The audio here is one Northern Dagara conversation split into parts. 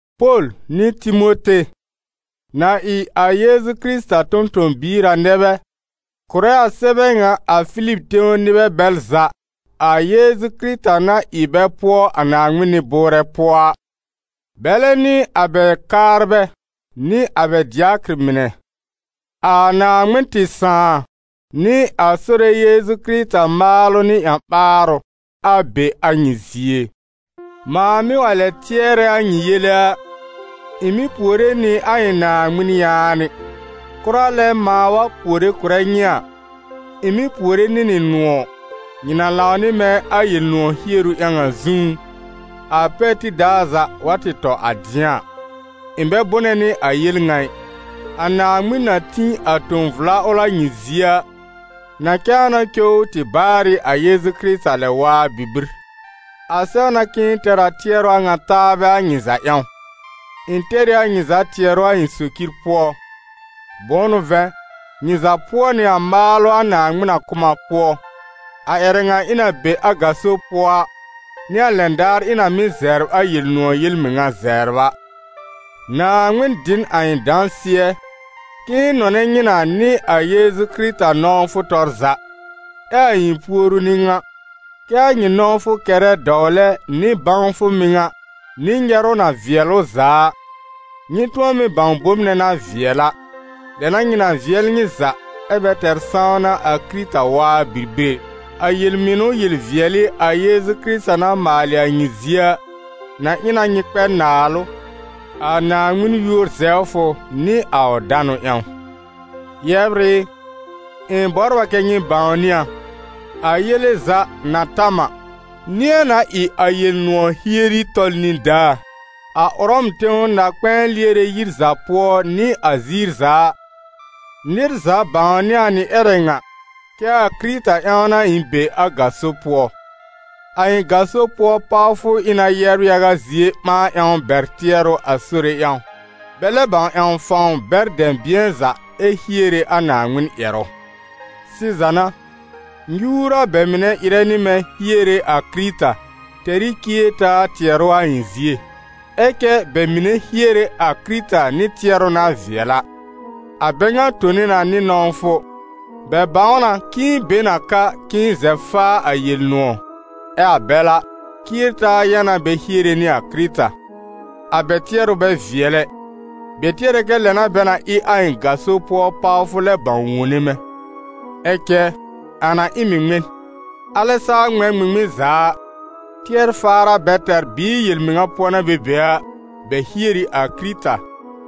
Pol nɩ Timote, na ɩ a Yeezu Kɩrɩta tõ-tõ-biir a, nɛ bɛ kʋ̀rɛ a sɛbɛ ŋa a Filib tẽw nɩbɛ bɛl za a Yeezu Kɩrɩta na ɩ bɛ pʋɔ a Naaŋmɩn nɩ-bʋʋrɛ pʋɔ a, bɛlɛ nɩ a bɛ kaarbɛ nɩ a bɛ dɩakɩr mɩnɛ. A Naaŋmɩn tɩ Sãà nɩ a Sore Yeezu Kɩrɩta maalʋ nɩ ƴã-ɓaarʋ, a be a nyɩ zie. Mãa mɩ́ wa lɛ tɩɛrɛ a nyɩ yele a, ɩ̃ mɩ́ puore nɩ a ɩ̃ Naaŋmɩn yaanɩ. Kʋra lɛ mãa wa puore kʋ̀rɛ nyɩ a, ɩ̃ mɩ́ puore nɩ nɩ nʋ̃ɔ̀, nyɩ na lãw nɩ mɛ̃ a Yel-nʋ̃ɔ̀ hieru ƴãw a zũú, a pɛr tib daar za wa tɩ tɔ a dɩ̃a a. Ɩ̃ bɛ bʋnɛ nɩ a yel ŋa ɩ: a Naaŋmɩn na tĩ a tõ-vla ʋl a nyɩ zie a, na cãa na cow ʋ tɩ baarɩ a Yeezu Kɩrɩta lɛ-waa bibir. A sɛw na k'ɩ̃ɩ tɛr a tɩɛrʋ a ŋa taabɛ a nyɩ za ƴãw. Ɩ̃ tɛr ɩ a nyɩ za tɩɛrʋ a ɩ̃ socir pʋɔ; bʋ̃ʋ n'ʋ vɛ̃, nyɩ za pʋɔ nɩ a maalʋ a Naaŋmɩn na kʋ̀ m a pʋɔ, a ƴɛrɛ ŋa ɩ̃ na be a gaso pʋɔ a, nɩ a lɛn daar ɩ̃ na mɩ́ zɛbr a Yel-nʋ̃ɔ̀ yel-mɩŋa zɛbr a. Naaŋmɩn dɩ n a ɩ̃ dãsɩɛ, k'ɩ̃ɩ nɔnɛ nyɩ na nɩ a Yeezu Kɩrɩta nɔ̃wfʋ tɔr za. Ɛ a ɩ̃ puoru n'ɩ ŋa: kɛ́ a nyɩ nɔ̃wfʋ kɛrɛ dɔwlɛ nɩ bãwfʋ mɩŋa nɩ nyɛrʋ na vɩɛl ʋ za a, nyɩ tʋ̃ɔ mɩ́ bãw bom nɛ na vɩɛl a. Lɛ n'a nyɩ na vɩɛl nyɩ za, ɛ́ bɛ tɛr sãwna a Kɩrɩta waa bibir ɛ. A yel-mɩnʋ yel-vɩɛlɩ a Yeezu Kɩrɩta na maalɩ a nyɩ zie a, na ɩ na nyɩ kpɛ naalʋ, a Naaŋmɩn yúor zɛwfʋ nɩ a ʋ danʋ ƴãw. Yɛbr ɩ, ɩ̃ bɔbr a kɛ́ nyɩ bãwnɩ a: a yele za na ta m a, nɩ̃ɛ na ɩ a Yel-nʋ̃ɔ̀ hieri tɔl nĩdaa. A Ʋrɔm tẽw na-kpɛ̃ɛ lɩɛrɛ yir za pʋɔ nɩ a ziir za a, nɩr za bãwnɩ a nɩ ƴɛrɛ ŋa, kɛ́ a Kɩrɩta ƴãw n'a ɩ̃ be a gaso pʋɔ. A ɩ̃ gaso pʋɔ pawfʋ ɩ na yɛbr yaga zie ɓãa ƴãw bɛr tɩɛrʋ a Sore ƴãw, bɛ lɛb bãw ƴãw fãw bɛr dɛ̃bɩ̃ɛ za ɛ hiere a Naaŋmɩn ƴɛrʋ. Sɩza n'a, nyuur a bɛ mɩnɛ ɩrɛ nɩ mɛ̃ hiere a Kɩrɩta, tɛr ɩ cier-taa tɩɛrʋ a ɩ̃ zie; ɛ cɛ bɛ mɩnɛ hiere a Kɩrɩta nɩ tɩɛrʋ na vɩɛl a. A bɛ ŋa tone na nɩ nɔ̃wfʋ, bɛ bãw na k'ɩ̃ɩ be n a ka k'ɩ̃ɩ zɛb faa a Yel-nʋ̃ɔ̀. Ɛ a bɛl a, cier-taa yã n'a bɛ hiere nɩ a Kɩrɩta. A bɛ tɩɛrʋ bɛ vɩɛl ɛ, bɛ tɩɛr kɛ lɛ n'a bɛ na ɩ a ɩ̃ gaso pʋɔ pawfʋ lɛ bãw wone mɛ̃. Ɛ cɛ, a na ɩ m ɩ ŋmɩn? Alɛ saa ŋmɛ̃ ŋmɩŋmɩn za a, tɩɛr-faar a bɛ tɛr, bɩɩ yel-mɩŋa pʋɔ n'a bɛ be a, bɛ hier ɩ a Kɩrɩta,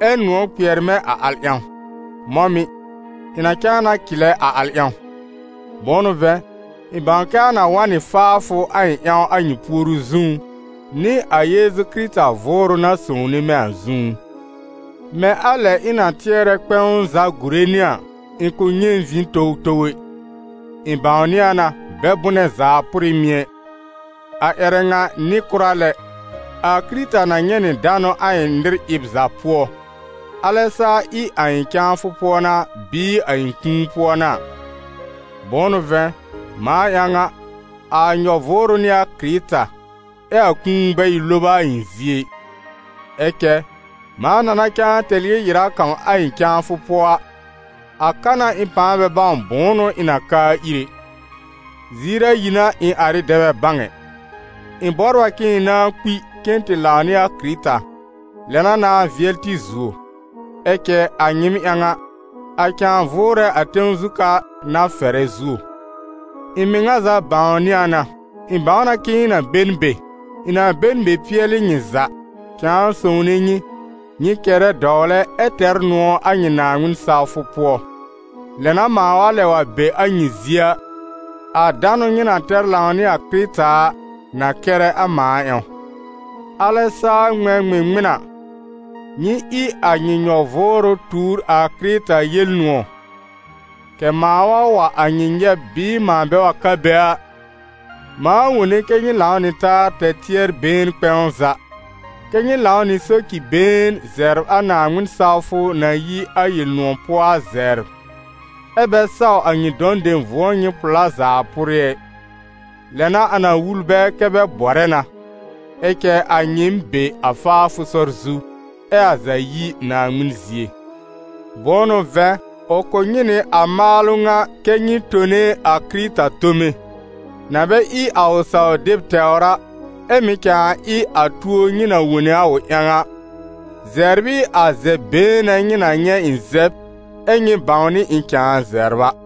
ɛ nʋ̃ɔ̀ kpɩɛr mɛ̃ a al ƴãw; mɔ̃ mɩ̀, ɩ̃ na cãa na cɩlɛ a al ƴãw. Bʋ̃ʋ n'ʋ vɛ̃, ɩ̃ bãw kɛ a na wa n nɩ faafʋ a ɩ̃ ƴãw a nyɩ puoru zũú, nɩ a Yeezu Kɩrɩta Vʋʋrʋ na sõwne mɛ̃ a zũú. Mɛ̃ a lɛ ɩ̃ na tɩɛrɛ kpɛ̃w za gùre nɩ a, ɩ̃ kʋ̃ nyɛ̃ vĩ towtow ɛ; ɩ̃ bãwnɩ a na, bɛ bʋnɛ zaa pʋrɩ mɩ̀ ɛ, a ƴɛrɛ ŋa nɩ kʋra lɛ, a Kɩrɩta na nyɛ̃ nɩ danʋ a ɩ̃ nɩr ɩb za pʋɔ, alɛ saa ɩ a ɩ̃ cãafʋ pʋɔ n'a, bɩɩ a ɩ̃ kũu pʋɔ n'a a. Bʋ̃ʋ n'ʋ vɛ̃, mãa ƴãw a, a nyɔ-vʋʋrʋ n'ɩ a Kɩrɩta, ɛ a kũu bɛ ɩ loba a ɩ̃ zie ɩ. Ɛ cɛ, mãa na na cãa tɛr yel-ɩra kãw a ɩ̃ cãafʋ pʋɔ a, a ka n'a ɩ̃ pãa bɛ bãw bʋ̃ʋ n'ʋ ɩ̃ na kaa ir ɛ. Ziir a ayi n'a ɩ̃ ar ɩ dɛ bɛ bãw ɛ: ɩ̃ bɔbr a k'ɩ̃ɩ nãá kpi cen tɩ lãw nɩ a Kɩrɩta, lɛ n'a nãá vɩɛl tɩ zuo; ɛ cɛ a nyɩɩm ƴãw a, a cãa vʋʋrɛ a tẽw zu ka n'a fɛrɛ zuo. Ɩ̃ mɩŋa za bãwnɩ a na, ɩ̃ bãw na k'ɩ̃ɩ na be n be, ɩ̃ na be n be pɩɛlɩ nyɩ za, cãa sõwne nyɩ, nyɩ kɛrɛ dɔwlɛ ɛ tɛr nʋ̃ɔ̀ a nyɩ Naaŋmɩn sawfʋ pʋɔ. Lɛ n'a mãa wa lɛb wa be a nyɩ zie a, a danʋ nyɩ na tɛr lãw nɩ a Kɩrɩta a, na kɛrɛ a mãa ƴãw. Alɛ saa ŋmɛ̃ ŋmɩŋmɩn a, nyɩ ɩ a nyɩ nyɔ-vʋʋrʋ tuur a Kɩrɩta Yel-nʋ̃ɔ̀, kɛ̀ mãa wa wa a nyɩ nyɛb bɩɩ mãa bɛ wa ka be a, mãa wone kɛ́ nyɩ lãw nɩ taa tɛr tɩɛr-been kpɛ̃w za, kɛ́ nyɩ lãw nɩ soci-been zɛbr a Naaŋmɩn sawfʋ na yi a Yel-nʋ̃ɔ̀ pʋɔ a zɛbr, ɛ́ bɛ saw a nyɩ dɔ̃ dem vʋ̃ɔ nyɩ pʋ̀lá zaa pʋrɩ ɛ, lɛ n'a a na wul bɛ kɛ́ bɛ bɔrɛ na, ɛ cɛ a nyɩɩm be a faafʋ sɔr zu, ɛ a za yi Naaŋmɩn zie. Bʋ̃ʋ n'ʋ vɛ̃, ʋ kʋ̀ nyɩ nɩ a maalʋ ŋa kɛ́ nyɩ tone a Kɩrɩta tome, na bɛ ɩ a ʋ saw-deb tɛwr a, ɛ́ mɩ̀ cãa ɩ a tuo nyɩ na wone a ʋ ƴãw a, zɛbr ɩ a zɛb-been nɛ nyɩ na nyɛ̃ ɩ̃ zɛb, ɛ́ nyɩ bãwnɩ ɩ̃ cãa zɛbr a.